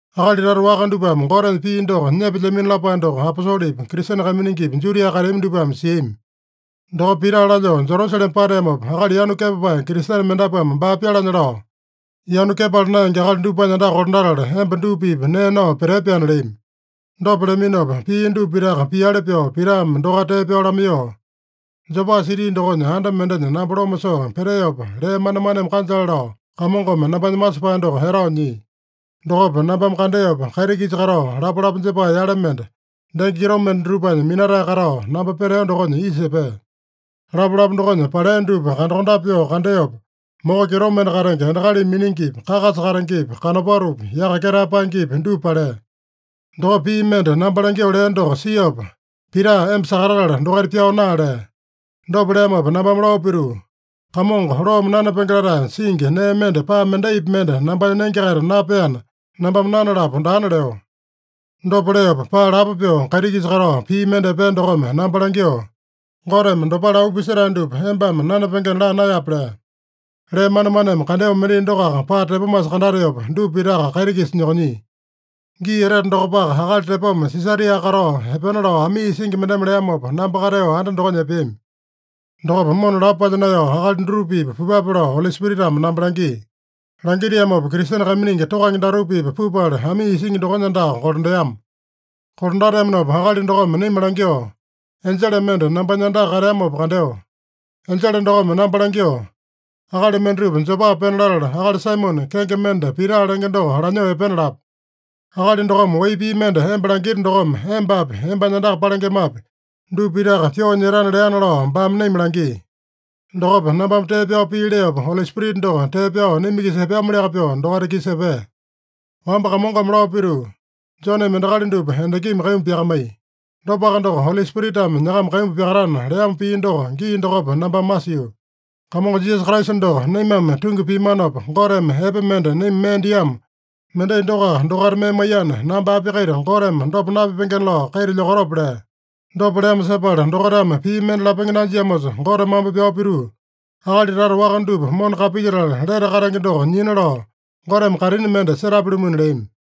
Akali tata waka dupame Gotenya pii doko nyepelyamino lapae doko aposolepi, Kristene kaiminingipi, Judia kateami dupame siami. Dokopa Pita lalyoo Jerusalema pateamopa, akali yanu kepapae Kristene mendapuame baa pyalanya lao, “Yanu kepala naenge akali dupanya andaka kolandatala, emba dupa-pipa nee nao petee-pyaana” leami. Dopa leaminopa, pia dupa pitaka piali pyoo Pitame dokaita tee pyao lamaiyoo, “Jopa siti dokonya anda mendenya namba loma soo peteopa, lee manemaneme kanjale lao, Kamongome nambanya masepae doko etao nyia. Dokopa nambame kandeopa, kaiti-kisa katao lapalapa jepae yale mende, denge kitomende dutupanya minatae katao, namba peteo dokonya isa epea. Lapalapa dokonya palea dupa kandakondape pyoo kandeopa, moko kitomende katenge endakalimi miningipi, kakasa katengepi, kanopatopi, yaka ketae paengepi, dupa palea. Dokopa pii mende namba langyoo lea doko siopa, ‘Pita, emba sakatatala dokaita pyao naa’ lea. Dopa leamopa nambame lao pituu, ‘Kamongo, loome nanapenge latae singi nee mende paa mendaipi mende nambanya nenge-kaita napeana, nambame nanalapo daana’ leo. Dopa leopa, paa lapo pyoo kaiti-kisa katao pii mende epea dokome namba langyoo, ‘Goteme dopale auu pisetae dupa embame nanapengena laa naeyape’ lea. Lee manemaneme kandeo mendai dokoaka paa tepomasa kandateopa, dupa pitaka kaiti-kisa nyokonyia. Gii etete dokopaka, akali tepoma Sisaria katao epena lao amii isingi mendeme leamopa, namba kateo anda dokonya epeami. Dokopa mona lapo palya naeyao, akali dutupa-pipa pupape lao Oli Spiritame namba langia. Langitiamopa, Kristene kaiminingi tokange datupa-pipa pupala, amii isingi dokonya andaka kolandeama. Kolandateamanopa akali dokome naima langyoo, ‘Enjele mende nambanya andaka kateamopa kandeo. Enjele dokome namba langyoo, “Akali mendatupa Jopa pena latala, akali Saimone, kenge mende Pita lenge doko lanyoo epena lape. Akali dokome wai pii mende emba langita dokome, embapi, embanya andaka palengemapi, dupa pitaka pyoo nyetana” leana’ lao baame naima langia. Dokopa, nambame tee pyao pii leopa, Oli Spirita doko tee pyao naima-kisa epeamoliaka pyoo dokaita-kisa epea. Wamba Kamongome lao pituu, ‘Joneme endakali dupa endakimi kaimbu pyakamaiya. Dopaka doko, Oli Spiritame nyakama kaimbu pyakatana’ leamo pii doko, gii dokopa nambame masio. Kamongo Jisasa Kraisa doko naimame tungi piamanopa, Goteme epe mende naima mee diamo, mendai dokoaka dokaita mee maiyana, namba api-kaita Goteme dopa napipengena lao kaita lyokatope?” lea. Dopa leamo sepala dokaitame pii mende lapenge nanjiamosa, Gote mambo pyao pituu, “Akali tata waka dupa mona kapilyetala, lete katenge doko nyina lao, Goteme kaitini mende setapya-lumuna” leami.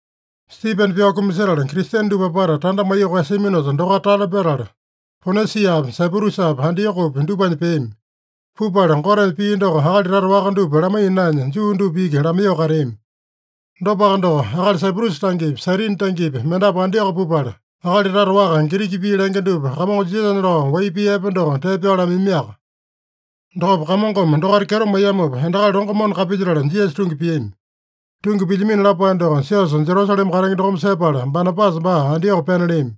Stipene pyao kumasetala, Kristene dupa apata tanda maiyoo koeyasiaminosa, dokaita tale petala, Ponisiapi, Saiprusapi, Antiokopi dupanya peami. Pupala Gotenya pii doko akali tata waka dupa lamaiya naenya, Juu dupa iki lamaiyoo kateami. Dopaka doko, akali Saiprusa tangepi, Sairini tangepi, mendapu Antioko pupala, akali tata waka, Giriki pii lenge dupa Kamongo Jisasanya lao wai pii epe doko tee pyao lamaiyamiaka. Dokopa Kamongome dokaita kyeto maiyamopa, endakali longo mona kapilyetala Jisasa tungi piami. Tungi pilyamino lapae doko siosa Jerusalema katenge dokome sepala, Banabasa baa Antioko pena leami.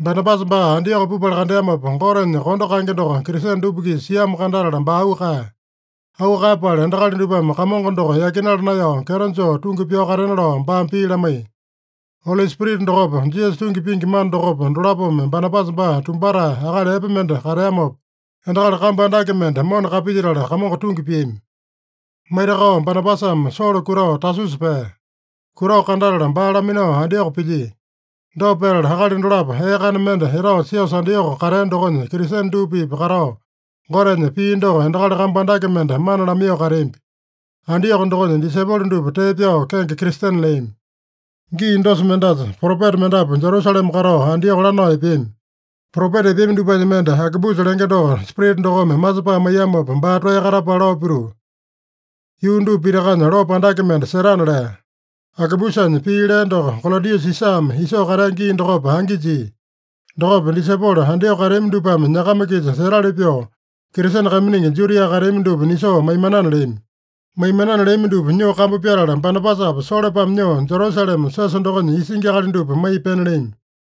Banabasa baa Antioko pupala kandeamopa, Gotenya kondo kaenge doko Kristene dupa-kisa siamo kandatala, baa auu kaeya. Auu kaeyapala, endakali dupame Kamongo doko yakinala naeyao kyeto joo tungi pyao katena lao baame pii lamaiya. Oli Spirita dokopa, Jisasa tungi pingi mana dokopa, dolapome Banabasa baa tumbatae, akali epe mende kateamopa, endakali kambu andake mende mona kapilyetala, Kamongo tungi piami. Maitakao Banabasame Solo kutao Tasusa pea. Kutao kandatala, baa laminao Antioko pilyia. Dopa petala, akali dolapo ee kana mende etao siosa Antioko katea dokonya Kristene dupa-pipa katao, Gotenya pii doko endakali kambu andake mende mana lamaiyoo kateambi. Antioko dokonya disaipolo dupa tee pyao kenge Kristene leami. Gii dosa mendasa propeta mendapu Jerusalema katao Antioko lanao epeami. Propeta epeami dupanya mende, Agabusa lenge doko Spirita dokome masepae maiyamopa, baa toeya katapala lao pituu, “Yuu dupa pitakanya lopo andake mende setana” lea. (Agabusanya pii lea doko Kolodiusa Sisame isoo katea gii dokopa angi jia.) Dokopa disaipolo Antioko kateami dupame nyakama-kisa setali pyoo, Kristene kaiminingi Judia kateami dupa nisoo maimanana leami. Maimanana leami dupa nyoo kambu pyatala, Banabasapa Solopame nyoo, Jerusalema siosa dokonya isingi akali dupa maiya pena leami.